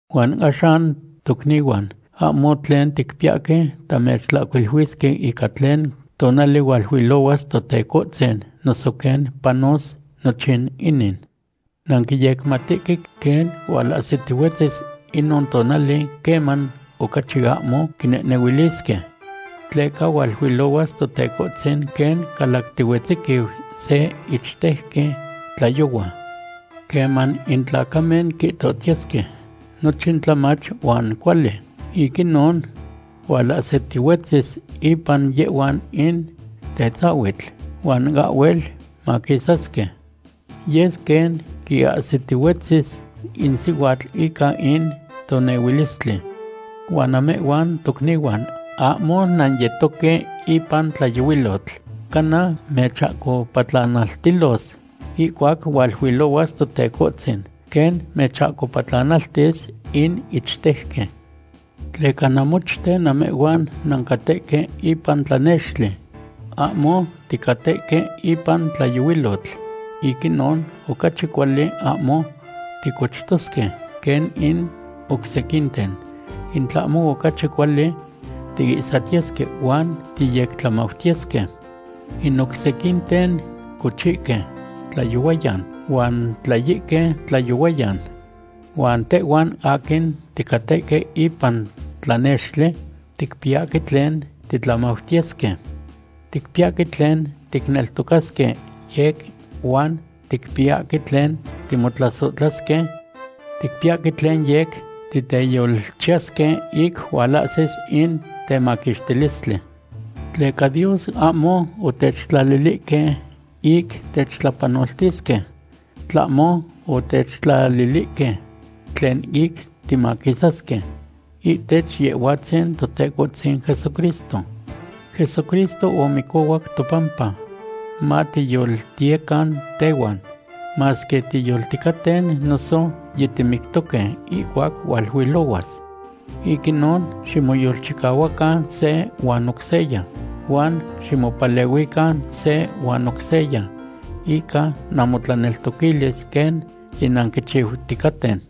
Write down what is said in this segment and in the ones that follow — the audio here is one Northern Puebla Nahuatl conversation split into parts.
Huan axan, tocnihuan, ahmo tlen ticpiyahque tamechtlahcuiluisque ica tlen tonali hualuilohuas Totecohtzin noso quen panos nochin inin. Nanquiyecmatihque quen hualahsitihuetzis inon tonali queman ocachi ahmo quinehnehuilisque. Tleca hualuilohuas Totecohtzin quen calactihuetziquiu se ichtejqui tlayohua. Queman in tlacamen quihtohtiyesque: “Nochin tlamach huan cuali”; ic inon hualahsitihuetzis ipan yehhuan in tetzahuitl, huan ahhuel maquisasque. Yes quen quiahsitihuetzis in sihuatl ica in tonehuilistli. Huan namehhuan tocnihuan, ahmo nanyetoque ipan tlayohuilotl, cana mechahcopatlanaltilos ihcuac hualuilohuas Totecohtzin, quen mechahcopatlanaltis in ichtejqui. Tleca namochten namehhuan nancatehque ipan tlanextli. Ahmo ticatehque ipan tlayohuilotl. Ic inon ocachi cuali ahmo ticochtosque quen in oc sequinten, in tlahmo ocachi cuali tiihsatiyesque huan tiyectlamautiyesque. In oc sequinten cochihque tlayohuayan huan tlayihque tlayohuayan. Huan tehhuan aquin ticatehque ipan tlanextli ticpiyahque tlen titlamautiyesque. Ticpiyahque tlen ticneltocasque yec huan ticpiyahque tlen timotlasohtlasque. Ticpiyahque tlen yec titeyolchiyasque ic hualahsis in temaquixtilistli. Tleca Dios ahmo otechtlalilihque ic techtlapanoltisque, tlahmo otechtlalilihque tlen ic timaquisasque ihtech Yehhuatzin Totecohtzin Jesucristo. Jesucristo omicohuac topampa, matiyoltiyecan tehuan, masque tiyolticaten noso yitimictosque ihcuac hualuilohuas. Ic inon ximoyolchicahuacan se huan oc seya, huan ximopalehuican se huan oc seya ica namotlaneltoquilis, quen yinanquichiuticaten.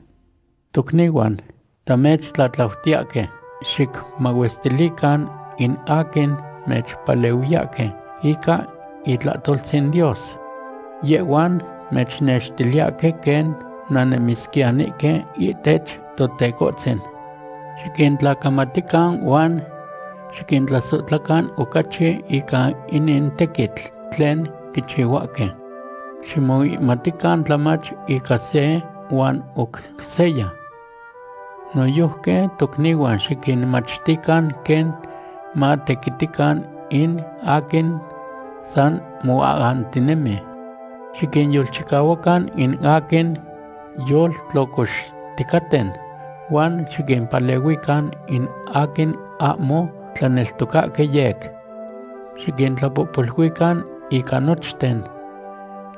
Tocnihuan, tamechtlatlautiyahque xicmahuestilican in aquin mechpalehuiyahque ica itlahtoltzin Dios. Yehhuan mechnextiliyahque quen nannemisquiyanihque ihtech Totecohtzin. Xiquintlacamatican huan xiquintlasohtlacan ocachi ican inin tequitl tlen quichihuahque. Ximoihmatican tlamach ica se huan oc seya. Noyojqui tocnihuan, xiquinmachtican quen matequitican in aquin san moahantinemi. Xiquinyolchicahuacan in aquin yoltlocoxticaten, huan xiquimpalehuican in aquin ahmo tlaneltocahque yec. Xiquintlapohpoluican ica nochten.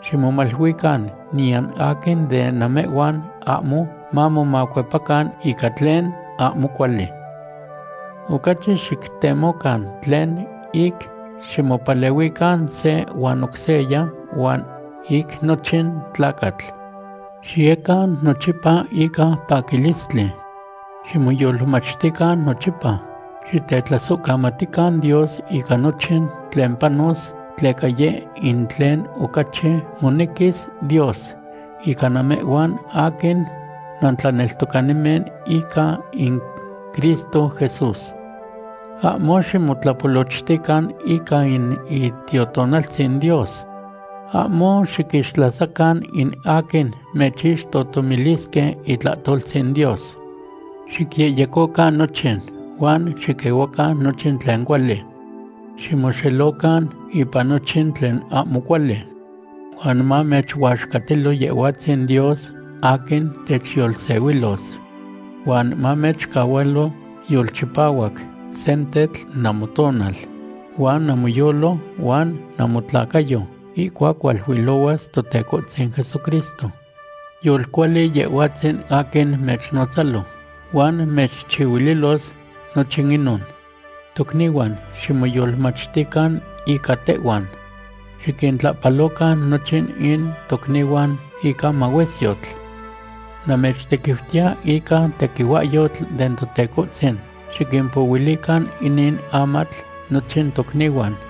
Ximomaluican niyan aquin de namehhuan ahmo mamomacuepacan ica tlen ahmo cuali. Ocachi xictemocan tlen ic ximopalehuican se huan oc seya, huan ic nochin tlacatl. Xiyecan nochipa ica paquilistli. Ximoyolmachtican nochipa. Xitetlasohcamatican Dios ica nochin tlen panos, tleca yeh in tlen ocachi monequis Dios ica namehhuan aquin nantlaneltocanimen ica in Cristo Jesús. Ahmo ximotlapolochtican ica in Itiotonaltzin Dios. Ahmo xiquixtlasacan in aquin mechixtohtomilisque itlahtoltzin Dios. Xicyehyecocan nochin, huan xiquehuacan nochin tlen cuali. Ximoxelocan ipan nochin tlen ahmo cuali. Huan mamechuaxcatilo Yehhuatzin Dios aquin techyolsehuilos. Huan mamechcahualo yolchipahuac sentetl namotonal, huan namoyolo, huan namotlacayo ihcuac hualuilohuas Totecohtzin Jesucristo. Yolcuali Yehhuatzin aquin mechnotzalo, huan mechchihuililos nochin inon. Tocnihuan, ximoyolmachtican ica tehhuan. Xiquintlahpalocan nochin in tocnihuan ica mahuesyotl. Namechtequiutiya ica tequihuahyotl den Totecohtzin, xiquimpohuilican inin amatl nochin tocnihuan.